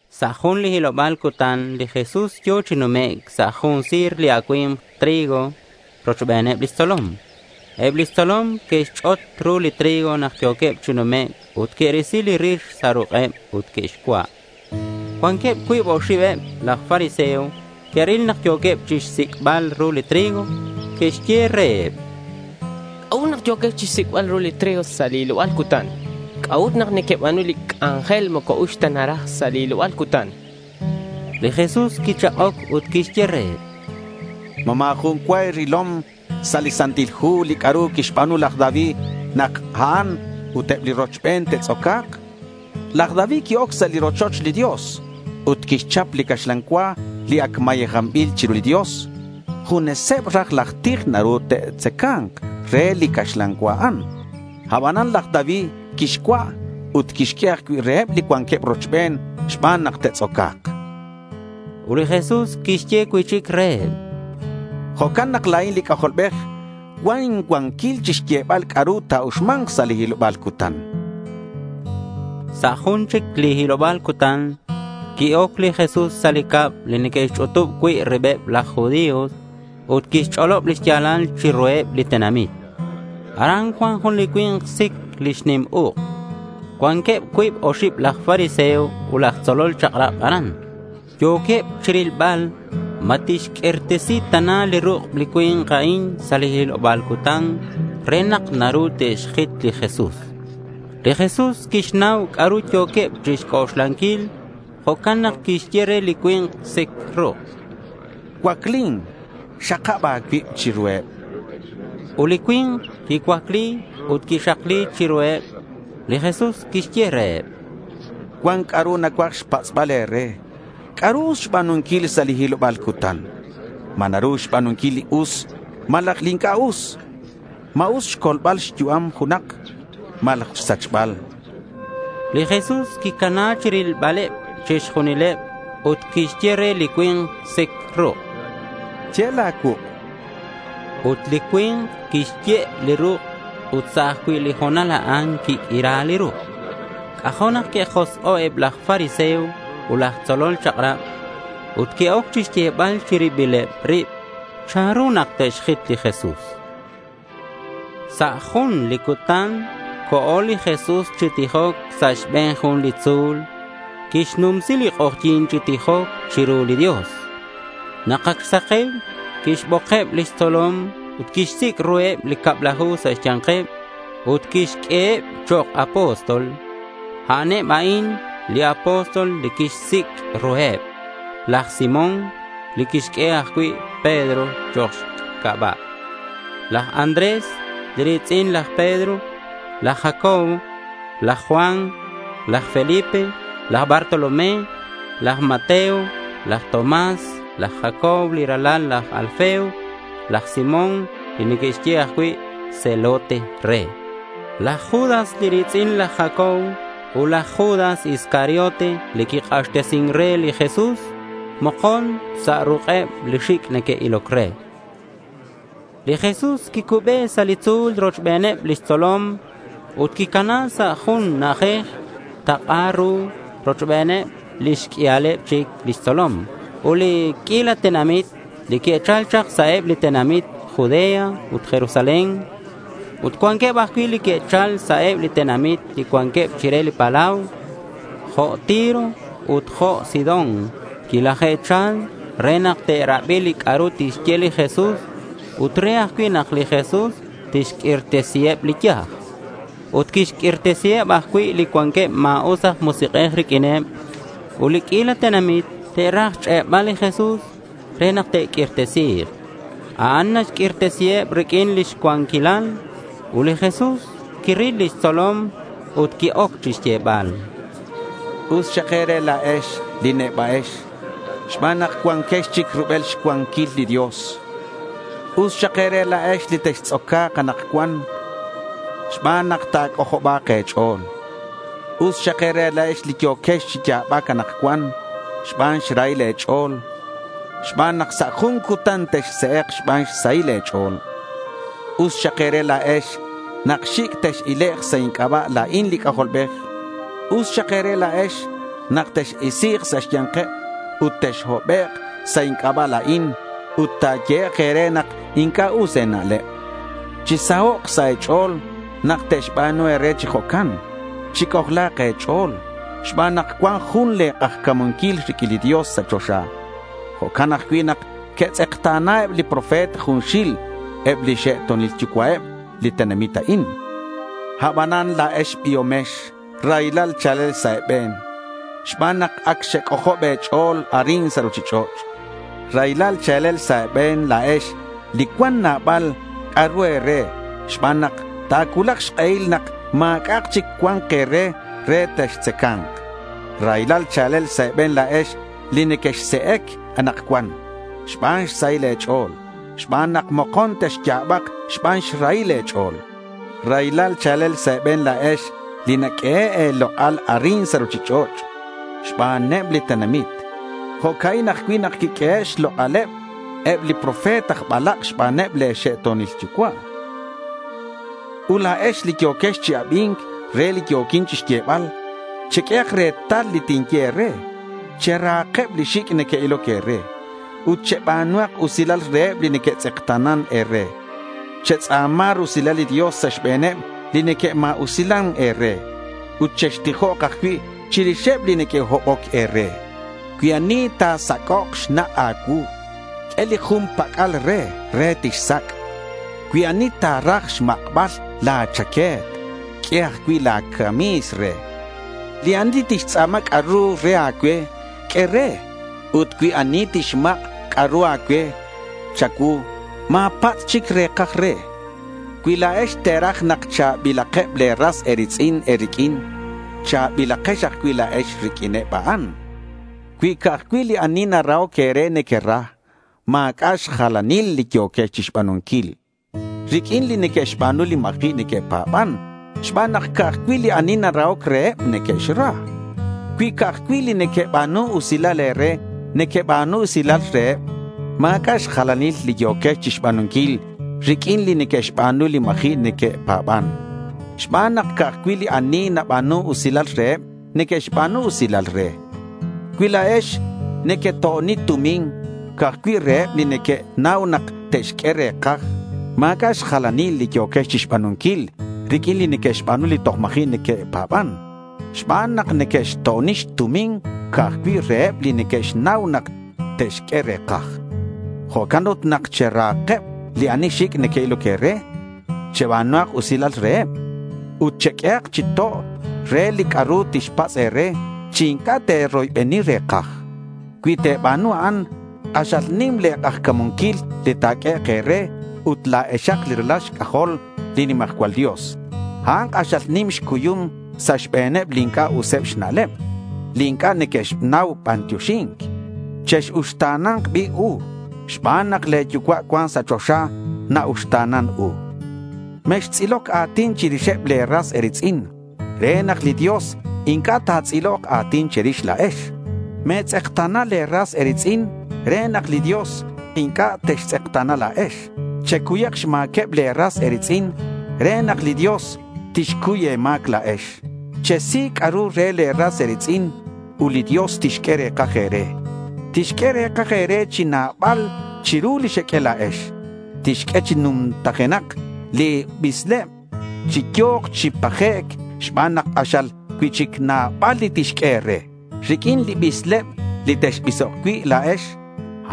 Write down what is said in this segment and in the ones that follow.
Sa' jun li hiloba̱l cutan li Jesús yo̱ chi numec' sa' jun si̱r li acui̱mk trigo rochbeneb lix tzolom. Eb lix tzolom que'xch'ot ru li trigo nak yo̱queb chi numec' ut que'risi li rix sa' ruk'eb ut que'xcua'. Cuanqueb cuib oxib eb laj fariseo que'ril nak yo̱queb chixsic'bal ru li trigo. Que'xye reheb: —¿C'a'ut nak yo̱quex chixsic'bal ru li trigo sa' li hiloba̱l cutan? ¿C'a'ut nak nequeba̱nu li c'anjel moco uxc ta naraj sa' li hiloba̱l cutan? chanqueb. Li Jesús quichak'oc ut quixye reheb: —¿Ma ma̱ jun cua e̱rilom sa' li Santil Hu li c'a'ru quixba̱nu laj David nak a'an ut eb li rochben te'tz'oca̱k? Laj David qui-oc sa' li rochoch li Dios ut quixchap li caxlan cua li ac mayejanbil chiru li Dios. Juneseb raj laj tij naru te'tzaca̱nk re li caxlan cua a'an. Abanan laj David quixcua' ut quixq'ue ajcui' reheb li cuanqueb rochben xban nak te'tz'oca̱k. Ut li Jesús quixye cui'chic reheb: —Jo'can nak la̱in li C'ajolbej cuan incuanquil chixyebal c'a'ru ta̱uxma̱nk sa' li hiloba̱l cutan, chan reheb. Sa' jun chic li hiloba̱l cutan qui-oc li Jesús sa' li cab li neque'xch'utub cui' ribeb laj judío ut quixch'olob lix ya̱lal chiruheb li tenamit. Aran cuan jun li cui̱nk sic lix nim uk'. Cuanqueb cuib oxib aj fariseo ut aj tzolol chak'rab aran. Yo̱queb chirilbal ma tixq'uirtesi tana li ruk' li cui̱nk a'in sa' li hiloba̱l cutan re nak naru te'xjit li Jesús. Li Jesús quixnau c'a'ru yo̱queb chixc'oxlanquil. Jo'can nak quixye re li cui̱nk li sic ruk': —Cuaclin. Xakab a̱cuib chiruheb, chan. Ut li cui̱nk quicuacli ut quixakli chiruheb. Li Jesús quixye reheb: —Cuan c'a'ru nacuaj xpatz'bal e̱re. ¿C'a'ru us xba̱nunquil sa' li hiloba̱l cutan? ¿Ma naru xba̱nunquil li us malaj li inc'a' us? ¿Ma us xcolbal xyu'am junak malaj xsachbal? chan reheb. Li Jesús quicana chirilbaleb chixju̱nkaleb, ut quixye re li cui̱nk li sic ruk': —Ye' la̱ cuuk', chan. Ut li cui̱nk quixye' li ruk' ut sa' ajcui' li ho̱nal a'an quiq'uira li ruk'. C'ajo' nak que'josk'o' eb laj fariseo ut laj tzolol chak'rab, ut que'oc chixyebal chi ribileb rib chanru nak te'xjit li Jesús. Sa' jun li cutan co̱ li Jesús chi tijoc sa' xbe̱n jun li tzu̱l. Quixnumsi li k'ojyi̱n chi tijoc chiru li Dios. Nak ac xsake̱u quixbokeb lix tzolom ut quixsic' ruheb li cablaju sa' xya̱nkeb ut quixq'ueheb chok' apóstol. A'aneb a'in li apóstol li quixsic' ruheb: laj Simón li quixq'ue ajcui' Pedro chok' xc'aba'; laj Andrés li ri̱tz'in laj Pedro; laj Jacobo; laj Juan; laj Felipe; laj Bartolomé; laj Mateo; laj Tomás; laj Jacobo li ralal laj Alfeo; laj Simón li neque'xye ajcui' Zelote re; laj Judas li ri̱tz'in laj Jacobo ut laj Judas Iscariote li quik'axtesin re li Jesús mokon sa' ruk'eb li xic' neque'iloc re. Li Jesús quicube sa' li tzu̱l rochbeneb lix tzolom ut quicana sa' jun na'ajej tak'a ru rochbeneb lix q'uialeb chic lix tzolom ut li q'uila tenamit li que'chal chak sa' eb li tenamit Judea ut Jerusalén. Ut cuan ajcui' li que'chal sa' eb li tenamit li cuanqueb chire li palau jo' Tiro ut Sidón. Quilaje'chal re nak te'rabi li c'a'ru tixye li Jesús ut re ajcui' nak li Jesús tixq'uirtesiheb li yaj. Ut quixq'uirtesiheb ajcui' li cuanqueb ma̱us aj musik'ej riq'uineb. Ut li q'uila tenamit te'raj xch'e'bal li Jesús re nak te'q'uirtesi̱k. A'an naxq'uirtesiheb riq'uin lix cuanquilal. Ut li Jesús quirileb lix tzolom ut qui-oc chixyebal: —Us xak e̱re la̱ex li neba'ex, xban nak cuanquex chic rubel xcuanquil li Dios. Us xak e̱re la̱ex li textz'oca̱k anakcuan xban nak ta̱c'ojoba̱k e̱ch'o̱l. Us xak e̱re la̱ex li yo̱quex chi ya̱bac anakcuan xban xrahil e̱ch'o̱l xban nak sa' jun cutan texse'ek xban xsahil e̱ch'o̱l. Us xak e̱re la̱ex nak xic' tex-ilek' sa' inc'aba' la̱in li C'ajolbej. Us xak e̱re la̱ex nak tex-isi̱k sa' xya̱nkeb ut texhobek' sa' inc'aba' la̱in ut ta̱yehek' e̱re nak inc'a' us e̱na'leb. Chisahok' sa' e̱ch'o̱l nak te'xba̱nu e̱re chi jo'can. Chic'ojla̱k e̱ch'o̱l xban nak cuan jun le̱ k'ajca̱munquil riq'uin li Dios sa' choxa. Jo'can ajcui' nak que'xtz'ekta̱na eb li profeta junxil eb lix xe'to̱nil xyucua'eb li tenamit a'in. Abanan, la̱ex li biomex raylal cha̱lel sa' e̱be̱n xban nak ac xec'ojob e̱ch'o̱l arin sa' ruchich'och'. Raylal cha̱lel sa' e̱be̱n la̱ex li cuan nabal c'a'ru e̱re xban nak ta̱cuulak xk'ehil nak ma̱c'a' chic cua̱nk e̱re re textzaca̱nk. Raylal cha̱lel sa' e̱be̱n la̱ex li nequexse'ec anakcuan xban xsahil e̱ch'o̱l xban nak mokon texya̱bak xban xrahil e̱ch'o̱l. Raylal cha̱lel sa' e̱be̱n la̱ex li naq'uehe' e̱lok'al arin sa' ruchich'och' xbaneb li tenamit. Jo'ca'in ajcui' nak que'q'uehe' xlok'al eb li profeta aj balak' xbaneb le̱ xe'to̱nil yucua'. Ut la̱ex li yo̱quex chi abi̱nc re li yo̱quin chixyebal, cheq'uehak retal li tinye e̱re. Cherahakeb li xic' neque'iloc e̱re. Ut cheba̱nuhak usilal reheb li neque'tz'ekta̱nan e̱re. Chetz'a̱ma̱k rusilal li Dios sa' xbe̱neb li neque'ma̱usilan e̱re. Ut chextijok ajcui' chirixeb li neque'hoboc e̱re. Cui ani ta̱sac'ok xnak' a̱cuu, q'ue li jun pac'al re, re tixsac'. Cui ani ta̱raj xmak'bal la̱ chaque̱t, q'ue ajcui' la̱ cami̱s re. Li ani tixtz'a̱ma c'a'ru re a̱cue, q'ue re. Ut cui ani tixmak' c'a'ru a̱cue cha̱cuu, ma̱patz' chic re̱kaj re. Cui la̱ex te̱raj nak cha̱bilakeb le̱ ras e̱ri̱tz'in e̱riq'uin, cha̱bilakex ajcui' la̱ex riq'uineb a'an. Cui ca'aj cui' li ani narahoc e̱re nequera, ma̱c'a' xjalanil li yo̱quex chixba̱nunquil, riq'uin li neque'xba̱nu li ma̱ji' neque'pa̱ban xban nak ca'aj cui' li ani narahoc reheb neque'xra. Cui ca'aj cui' li neque'ba̱nun usilal e̱re, nequeba̱nu usilal reheb, ma̱c'a' xjalanil li yo̱quex chixba̱nunquil riq'uin li neque'xba̱nu li ma̱ji' neque'pa̱ban. Xban nak ca'aj cui' li ani naba̱nun usilal reheb neque'xba̱nu usilal re. Cui la̱ex nequeto'oni tumin ca'aj cui' reheb li nequenau nak te'xq'ue re̱kaj, ma̱c'a' xjalanil li yo̱quex chixba̱nunquil riq'uin li neque'xba̱nu li toj ma̱ji' neque'pa̱ban xban nak neque'xto'oni tumin ca'aj cui' reheb li neque'xnau nak te'xq'ue re̱kaj. Jo'can ut nak cherahakeb li ani xic' neque'iloc e̱re. Cheba̱nuhak usilal reheb. Ut cheq'uehak chi to' re li c'a'ru tixpatz' e̱re chi inc'a' te̱roybeni re̱kaj. Cui te̱ba̱nu a'an, k'axal nim le̱ k'ajca̱munquil li ta̱q'uehek' e̱re ut la̱exak li ralal xc'ajol li nimajcual Dios. A'an k'axal nim xcuyum sa' xbe̱neb li inc'a' useb xna'leb li inc'a' neque'xnau bantioxi̱nc. Chex-uxta̱na̱nk bi' u xban nak le̱ yucua' cuan sa' choxa na-uxta̱nan u. Mextz'iloc a̱tin chirixeb le̱ ras e̱ri̱tz'in re nak li Dios inc'a' ta̱tz'ilok a̱tin che̱rix la̱ex. Me̱tz'ekta̱na le̱ ras e̱ri̱tz'in re nak li Dios inc'a' textz'ekta̱na la̱ex. Checuyak xma̱queb le̱ ras e̱ri̱tz'in re nak li Dios tixcuy e̱ma̱c la̱ex. Chesi c'a'ru re le̱ ras e̱ri̱tz'in ut li Dios tixq'ue re̱kaj e̱re. Tixq'ue re̱kaj e̱re chi nabal chiru li xeq'ue la̱ex. Tixq'ue chi nujenak li bisleb, chi yo̱k chi pajec' xban nak k'axal cui'chic nabal li tixq'ue e̱re. Riq'uin li bisleb li texbisok cui' la̱ex,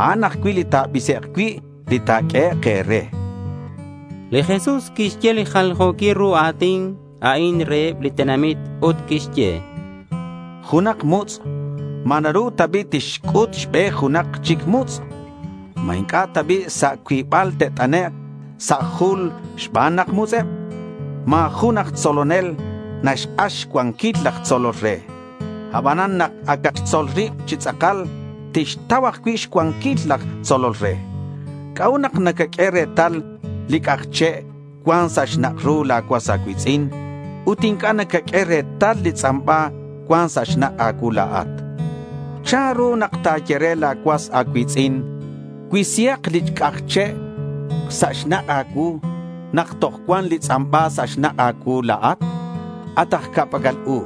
a'an ajcui' li ta̱bisek' cui' li ta̱q'uehek' e̱re, chan. Li Jesús quixye li jaljo̱quil ru a̱tin a'in reheb li tenamit ut quixye: —Junak mutz', ¿Ma naru ta bi' tixc'ut xbe junak chic mutz'? ¿Ma inc'a' ta bi' sa' cuibal te't'anek' sa' jul xban nak mutz'eb? Ma̱ jun aj tzolonel naxk'ax xcuanquil laj tzolol re. Abanan nak acak xtzol rib chi tz'akal, tixtau ajcui' xcuanquil laj tzolol re. ¿C'a'ut nak nacaq'ue retal li c'aj che' cuan sa' xnak' ru la̱ cuas a̱cui̱tz'in ut inc'a' nacaq'ue retal li tz'amba cuan sa' xnak' a̱cuu la̱at? ¿Chanru nak ta̱ye re la̱ cuas a̱cui̱tz'in, “Cuisihak li c'aj che' sa' xnak' a̱cuu”, nak toj cuan li tz'amba sa' xnak' a̱cuu la̱at? At aj ca'pac'al u,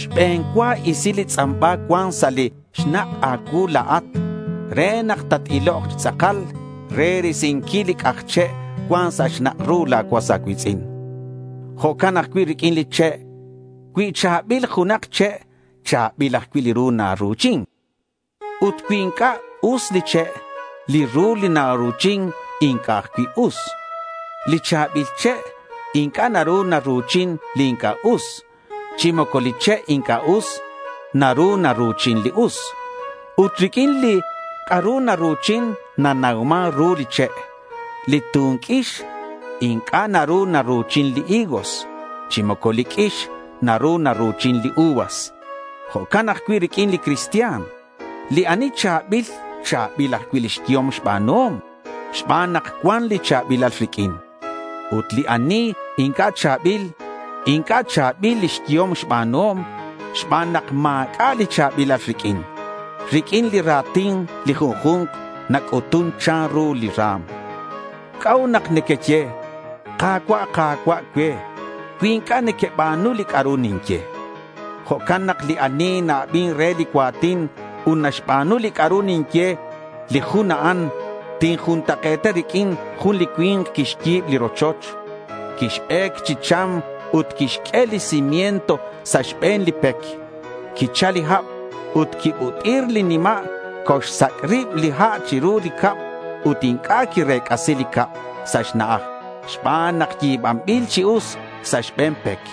xbe̱n cua isi li tz'amba cuan sa' li xnak' a̱cuu la̱at, re nak tat-ilok chi tz'akal re risinquil li c'aj che' cuan sa' xnak' ru la̱ cuas a̱cui̱tz'in. Jo'can ajcui' riq'uin li che'. Cui cha̱bil junak che', cha̱bil ajcui' li ru naru̱chin. Ut cui inc'a' us li che', li ru li naru̱chin inc'a' ajcui' us. Li cha̱bil che' inc'a' naru naru̱chin li inc'a' us, chi moco li che' inc'a' us naru naru̱chin li us. Ut riq'uin li ru naru̱chin nanauman ru li che'. Li tun q'uix inc'a' naru naru̱chin li higos chi moco li q'uix naru naru̱chin li uvas. Jo'can ajcui' riq'uin li cristian. Li ani cha̱bil, cha̱bil ajcui' lix yehom xba̱nuhom xban nak cuan li cha̱bilal riq'uin. Ut li ani inc'a' cha̱bil, inc'a' cha̱bil lix yehom xba̱nuhom xban nak ma̱c'a' li cha̱bilal riq'uin. Riq'uin li ra̱tin li junju̱nk nac'utun chanru li ra̱m. ¿C'a'ut nak nequeye, “Ka̱cua', Ka̱cua'” cue cui inc'a' nequeba̱nu li c'a'ru ninye? Jo'can nak li ani na-abin re li cua̱tin ut naxba̱nu li c'a'ru ninye, li jun a'an tinjuntak'e̱ta riq'uin jun li cui̱nk quixyi̱b li rochoch. Quixbec chi cham ut quixq'ue li cimiento sa' xbe̱n li pec. Quichal li hab ut quibut'ir li nima'. Coxsac' rib li ha' chiru li cab ut inc'a' quirec'asi li cab sa' xna'aj xban nak yi̱banbil chi us sa' xbe̱n pec.